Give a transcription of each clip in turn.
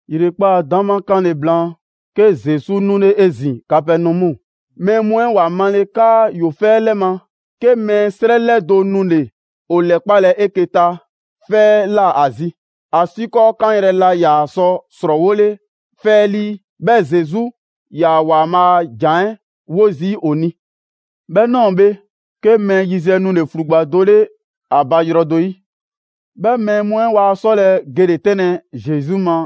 ‑Yrekpaa' 'dama 'kanle‑ blaan, 'ke Zesu 'nule 'ezin‑ Kapɛnɔmu. Mɛɛ mu 'ɛ ‑wa male 'kaa ‑yoo 'fɛ 'lɛ ma, 'ke mɛɛ 'srɛ 'lɛdo‑ nule‑ ‑o 'lɛkpalɛ 'eke‑ ta 'fɛ 'ɛ ꞊la ‑a zi, ‑asiikɔɔ 'kanyrɛ‑ laa ‑yaa sɔ ‑srɔɔwole 'fɛ 'ɛ 'lii. 'Bhɛɛ‑ Zesu 'yaa‑ ‑Waanbhaa' a ‑jan 'ɛ 'wo zii' ‑o ni. 'Bhɛ ꞊nɔɔ bhe, 'ke mɛɛ yiziɛ nule‑ ‑flugba do 'le ‑a ba yrɔ do 'yi. 'Bhɛ mɛɛ mu 'ɛ waa 'sɔlɛ‑ gele‑ 'tɛnlɛ‑ Zesu ma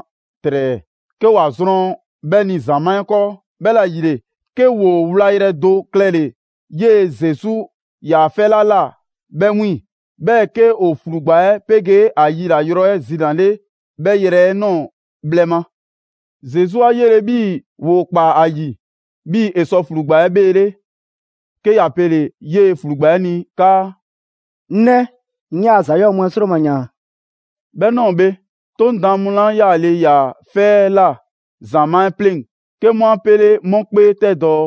‑trɛɛ, 'ke ‑wa zrɔn 'bhɛ ni ‑zamaa' 'ɛ 'kɔɔ. 'Bhɛla‑ ‑yile, 'ke ‑woo wlayrɛ do klɛle‑ 'yee‑ Zesu 'yaa‑ 'fɛ 'la ꞊la 'bhɛ 'wiiŋ‑. 'Bhɛɛ‑ 'ke ‑o ‑flugba' 'ɛ 'pegee ‑a 'yila‑ yrɔ 'ɛ zinale 'bhɛ yrɛ 'ɛ ꞊nɔɔ bhlɛ ma. Zesu 'a 'yele‑ 'bhii‑ ‑woo ‑kpaa ‑a 'yi, 'bhii‑ ‑e sɔ ‑flugba 'ɛ 'bheele, 'ke ‑ya 'pele 'yee‑ ‑flugba 'ɛ ni 'kaa: «'Ŋ 'nɛ, 'ŋ 'yaa‑ ‑za 'yɔɔ‑ mu 'ɛ ‑sroma ‑yaan.» 'Bhɛ ꞊nɔɔ bhe, 'Toŋ daan mu 'la 'yaale‑ ‑yaa 'fɛ 'ɛ ꞊la ‑zamaa' 'ɛ 'pleŋ‑ 'ke 'mu 'a pele‑ 'mu 'kpee 'tɛ dɔɔ: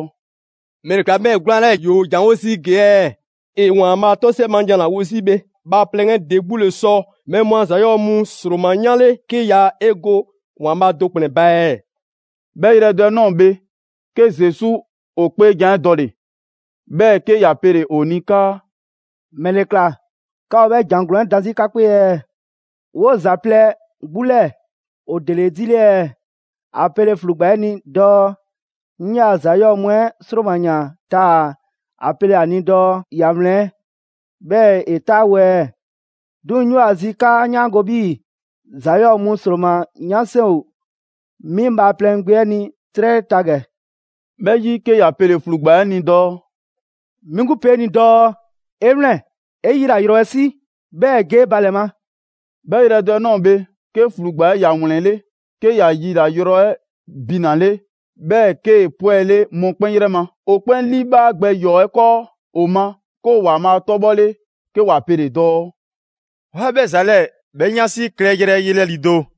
«‑Mɛle ‑kla 'bhɛɛ‑ 'gwlaan‑ 'lɛɛ‑ ‑yoo ‑janwo' zii' ‑gee' ɛɛ? ‑E ‑Waanbhaa' 'tɔsiɛ ma jan ‑la wo 'zi bhe. Bhaaplɛŋ 'ɛ ‑de 'gbu ‑le sɔ mɛɛ mu a ‑za 'yɔɔ‑ mu ‑sroma 'yanle 'ke ya 'e go ‑Waanbhaa' do ‑kplɛn ba ɛɛ?» 'Bhɛ yrɛ do 'ɛ ꞊nɔɔ bhe, 'ke Zesu ‑o 'kpeejan‑ 'ɛ dɔle‑. 'Bhɛɛ‑ 'ke ‑ya pele‑ ‑o ni 'kaa: «‑Mɛle ‑kla 'ka ‑o 'bhɛ ‑jan ‑glɔɔn 'ɛ dan 'zi 'ka 'kpee ɛɛ? 'Woo‑ ‑za plɛ 'gbu 'lɛɛ‑ ‑o ‑dele 'edile ɛɛ, ‑a pele ‑flugba 'ɛ ni dɔɔ 'ŋ ‑yaa' ‑za 'yɔɔ mu 'ɛ ‑sroma ‑yaan taa‑ ‑a pele ‑a ni dɔɔ ‑ya ‑wlɛn ɛɛ, 'bhɛɛ‑ ‑e 'taawo‑ ɛɛ? 'Duŋ‑ 'ŋ 'yoo‑ ‑a zi 'kaa‑ 'yaango‑ 'bhii‑ ‑za 'yɔɔ‑ mu ‑sroma 'yan 'seŋ ‑o 'mi Bhaaplɛŋ Gbe 'ɛ ni 'trɛ 'ɛ ta ‑gɛ.» 'Bhɛ 'yi 'ke ‑ya pele‑ ‑flugba' 'ɛ ni dɔɔ: «'Mi 'gbu pe ni dɔɔ: 'E 'wlɛn‑, 'e 'yila‑ yrɔ 'ɛ 'si, 'bhɛɛ‑ ge 'e ba ‑lɛ ma!» 'Bhɛ yrɛ do 'ɛ ꞊nɔɔ bhe, 'ke ‑flugba 'ɛ ‑ya ‑wlɛnle', 'ke ‑ya yila‑ yrɔ 'ɛ binale, 'bhɛɛ‑ 'kee‑ 'pwɛle mɔkpɛn' 'yrɛ ma. ‑O 'kpɛn 'liibhaa gbɛ ‑yɔɔ 'ɛ 'kɔɔ ‑o ma 'ke ‑o ‑Waanbhaa' 'tɔbhɔle, 'ke ‑wa pe dɔɔ: «'Waa 'bhɛ ‑za 'lɛɛ 'bhɛ 'yansi klɛyrɛ yelɛ ‑lido'.»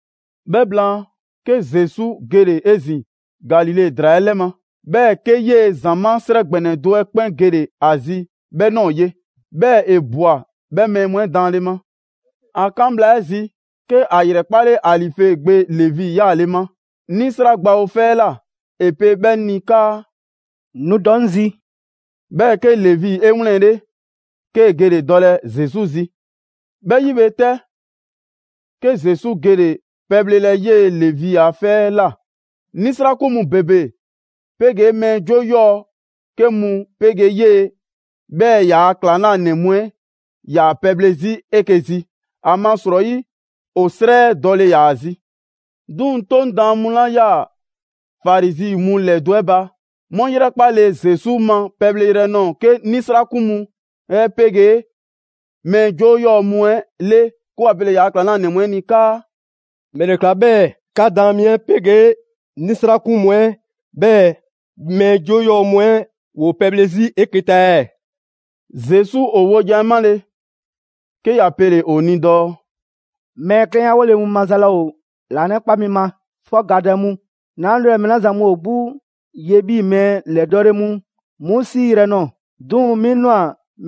'Bhɛ blaan, 'ke Zesu gele‑ 'ezin‑ Galile ‑draa 'ɛ 'lɛ ma. 'Bhɛɛ‑ 'ke eyee‑ ‑zamaa' 'srɛ ‑gbɛnɛ do 'ɛ 'kpɛn gele‑ ‑a zi 'bhɛ ꞊nɔɔ ye; 'bhɛɛ‑ ‑e ꞊bwa 'bhɛ mɛɛ mu 'ɛ daanle ma. ‑A 'kan bhla 'ɛ zi, 'ke ‑a ‑yrɛkpale Alife gbe Levi 'yaale‑ ma 'nisra gbawo 'fɛ 'ɛ ꞊la. ‑E pe 'bhɛ ni 'kaa: «Nu dɔ 'ŋ zi!» 'Bhɛɛ‑ 'ke Levi 'e 'wlɛnle‑, 'kee‑ gele‑ dɔlɛ Zesu zi. 'Bhɛ 'yi bhe 'tɛ, 'ke Zesu gele‑ pɛbhlelɛ 'yee‑ Levi a 'fɛ 'ɛ ꞊la. 'Nisrakun mu ‑bebe 'pegee mɛɛ 'joo 'yɔɔ‑ 'ke mu 'pegee 'yee‑, 'bhɛɛ‑ ‑yaa' ‑klaŋlanɛ mu 'ɛ 'yaa‑ pɛbhle 'zi 'eke‑ zi, ‑amasrɔyi ‑o 'srɛ 'ɛ dɔle ‑yaa zi. 'Duŋ‑ 'Toŋ daan mu 'la 'yaa‑ Farizi mu ‑lɛdo' 'ɛ ba, 'mu 'yrɛkpale Zesu ma pɛleyrɛ 'ɛ ꞊nɔɔ 'ke 'nisrakun mu 'ɛ 'pegee mɛɛ 'joo 'yɔɔ‑ mu 'ɛ 'le, 'ke ‑wa pele‑ ‑yaa' ‑klaŋlanɛ mu 'ɛ ni 'kaa: «‑Mɛle ꞊kla 'bhɛɛ‑ 'ka daan mi 'ɛ 'pegee 'nisrakun mu 'ɛ, 'bhɛɛ‑ mɛɛ 'joo 'yɔɔ‑ mu 'ɛ ‑woo pɛbhle 'zi 'eke‑ ta ɛɛ?» Zesu ‑o wojan 'ɛ 'male, 'ke ‑ya pele‑ ‑o ni dɔɔ: «Mɛɛ 'klɛnyawole mu maza laa ‑o ‑laanɛkpa mi ma, 'fɔ gadɛ mu. 'Naa 'nulɛ‑ mɛɛ 'la zan mu ‑o 'gbu ye 'bhii‑ mɛɛ ‑lɛdɔɔle mu 'mu 'siiyrɛ‑ ꞊nɔɔ, 'duŋ‑ 'mi ꞊nwa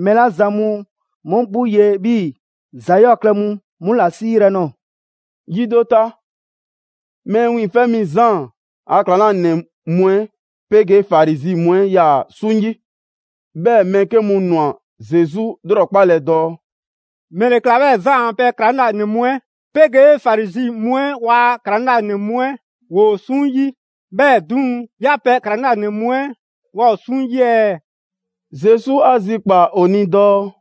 mɛɛ 'la zan mu 'mu 'gbu ye 'bhii‑ ‑za 'yɔɔ‑ klɛ mu 'mu ‑la 'siiyrɛ‑ nɔɔ‑.» Yi do ta, Mɛɛ Wiiŋfɛ' Mi Zaan a ‑klaŋlanɛ mu 'ɛ 'pegee Farizi mu 'ɛ 'yaa‑ 'suŋ 'yi. 'Bhɛɛ‑ mɛɛ 'ke mu ꞊nwa Zesu ‑lrɔkpalɛ dɔɔ: «‑Mɛle ꞊kla 'bhɛɛ‑ Zaan a pɛ ‑klaŋlanɛ mu 'ɛ 'pegee Farizi mu 'ɛ ‑waa' ‑klaŋlanɛ mu 'ɛ ‑woo 'suŋ 'yi, 'bhɛɛ‑ 'duŋ‑ 'yaa‑ pɛ ‑klaŋlanɛ mu 'ɛ waa ‑o 'suŋ 'yi ɛɛ?» Zesu 'a zikpaa‑ ‑o ni dɔɔ: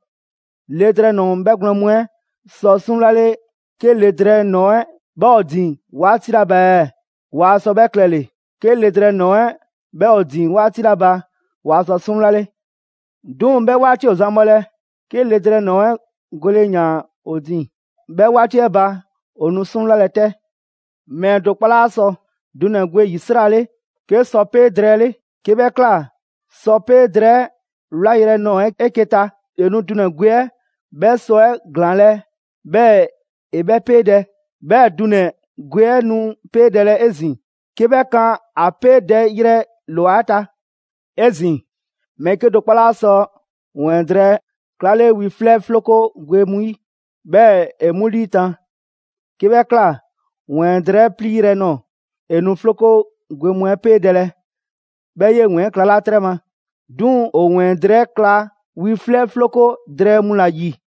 «Le drɛɛ ‑nɔɔ 'ɛ 'bhɛgwlɛn‑ mu 'ɛ sɔ 'suŋwlale 'ke le drɛɛ ‑nɔɔ 'ɛ 'bhɛ ‑o ‑o ‑din 'waati 'la ba ɛɛ? Waa sɔ 'bhɛ klɛle‑, 'ke le drɛɛ ‑nɔɔ 'ɛ 'bhɛ ‑o ‑o ‑din 'waati 'la ba, waa sɔ 'suŋwlale. 'Duŋ‑ 'bhɛ 'waati ‑o zan bhɔlɛ, 'ke le drɛɛ ‑nɔɔ 'ɛ gole ‑yaan ‑o ‑din. 'Bhɛ 'waati 'ɛ ba, ‑o nu 'suŋwlalɛ 'tɛ.» «Mɛɛ do 'kpɔ 'laa sɔ dunɛ‑ gwe ‑yisrale 'ke sɔpee' drɛɛ 'le. 'Kee‑ 'bhɛ ꞊kla, sɔpee' drɛɛ 'ɛ 'wlayrɛ‑ nɔɔ‑ 'eke‑ ta, ‑e nu dunɛ‑ gwe 'ɛ 'bhɛ sɔ 'ɛ ‑glaanlɛ' 'bhɛɛ‑ ‑e 'bhɛ 'peedɛ‑. 'Bhɛɛ‑ dunɛ‑ gwe 'ɛ nu 'peedɛlɛ 'ezin‑, 'ke 'bhɛ kan ‑a 'peedɛyrɛ ‑lwa 'ɛ ta. 'Ezin‑, mɛɛ 'kedo‑ 'kpɔ 'laa sɔ ‑wɛɛn drɛɛ 'klale wi 'flɛ 'floko gwe mu 'yi, 'bhɛɛ‑ ‑e 'mu 'liitan‑. 'Kee‑ 'bhɛ ꞊kla, ‑wɛɛn drɛɛ 'ɛ 'pliiyrɛ‑ nɔɔ‑, ‑e nu 'floko gwe mu 'ɛ 'peedɛlɛ, 'bhɛɛ‑ 'yee‑ ‑wɛɛn 'ɛ klalaa' 'trɛ ma. 'Duŋ‑ ‑o ‑wɛɛn drɛɛ 'ɛ 'kla wi 'flɛ 'floko drɛɛ mu ‑la ‑yi.»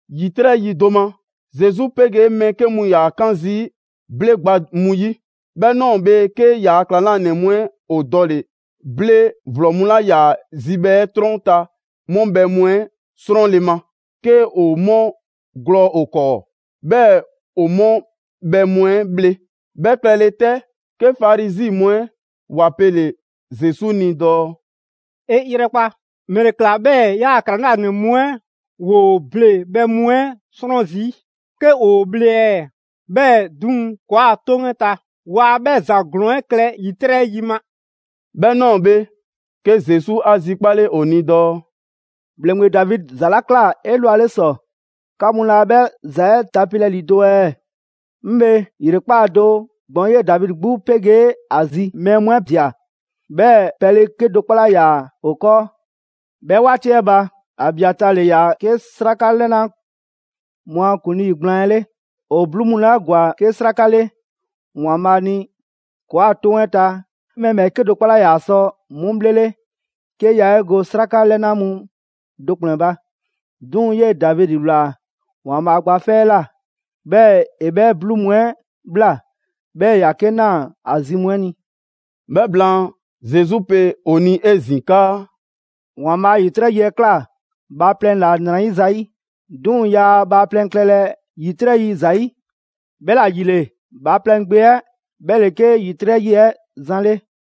‑Yitrɛ' yi do ma, Zesu 'pegee mɛɛ 'ke mu ‑yaa 'kan zii' ble gba mu 'yi. 'Bhɛ ꞊nɔɔ bhe, 'ke ‑yaa' ‑klaŋlanɛ mu 'ɛ ‑o dɔle‑ ble ‑vlɔ mu 'la 'yaa‑ zibhɛ 'ɛ 'trɔn ta 'mu bhɛ mu 'ɛ 'srɔnle‑ ma, 'ke ‑o 'mu ‑glɔɔ ‑o 'kɔɔ, 'bhɛɛ‑ ‑o 'mu bhɛ mu 'ɛ bhle. 'Bhɛ klɛle 'tɛ, 'ke Farizi mu 'ɛ ‑wa pele‑ Zesu ni dɔɔ: «'E 'yrɛkpa, ‑mɛle ꞊kla 'bhɛɛ‑ 'yaa‑ ‑klaŋlanɛ mu 'ɛ ‑woo ble bhɛ mu 'ɛ 'srɔn zii' 'ke ‑woo bhle ɛɛ? 'Bhɛɛ‑ 'duŋ‑, ‑kɔɔa' 'toŋ 'ɛ ta, waa 'bhɛ ‑za ‑glɔɔn 'ɛ klɛ ‑yitrɛ' yi ma.» 'Bhɛ ꞊nɔɔ bhe, 'ke Zesu 'a zikpale ‑o ni dɔɔ: «‑Bhleŋgbe Davidi ‑za 'la ꞊kla 'elwale ‑sɔ, 'ka mu laa 'bhɛ ‑za 'ɛ tapelɛ ‑lido' ɛɛ? 'Ŋ bhe, ‑yrekpaa' do, gbɔn 'yee Davidi 'gbu 'pegee ‑a zi mɛɛ mu 'ɛ ꞊dia, 'bhɛɛ‑ pɛle 'kedo‑ 'kpɔ 'laa ‑yaa ‑o 'kɔɔ. 'Bhɛ 'waati 'ɛ ba, Abiataa ‑le ‑yaa 'ke 'sraka 'lɛna mu a ‑kuŋlii gblaan 'ɛ 'le. ‑O 'bluu mu 'la ‑gwa 'ke sraka 'le ‑Waanbhaa' ni, ‑kɔɔa' 'toŋ 'ɛ ta, mɛɛ ‑bhɛɛke' do 'kpɔ 'laa ‑yaa sɔ 'mu bhlele' 'ke ‑yaa 'e go 'sraka 'lɛna mu do ‑kplɛn ba. 'Duŋ‑ 'yee‑ Davidi ꞊wlaa ‑Waanbhaa' gba 'fɛ 'ɛ ꞊la, 'bhɛɛ‑ ‑e 'bhɛ 'bluu mu 'ɛ ꞊bhla, 'bhɛɛ‑ ‑ya 'ke ꞊naa ‑a zi mu 'ɛ ni.» 'Bhɛ blaan, Zesu pe ‑o ni 'ezin‑ 'kaa: «‑Waanbhaa' ‑yitrɛ' yi 'ɛ ꞊kla bhaaplɛŋ ‑la ‑nrayiza 'yi, 'duŋ‑ yaa bhaaplɛŋ klɛlɛ ‑yitrɛ' yi ‑zayi'. 'Bhɛla‑ ‑yile, Bhaaplɛŋ Gbe 'ɛ 'bhɛ ‑le 'ke ‑yitrɛ' yi 'ɛ zan 'le.»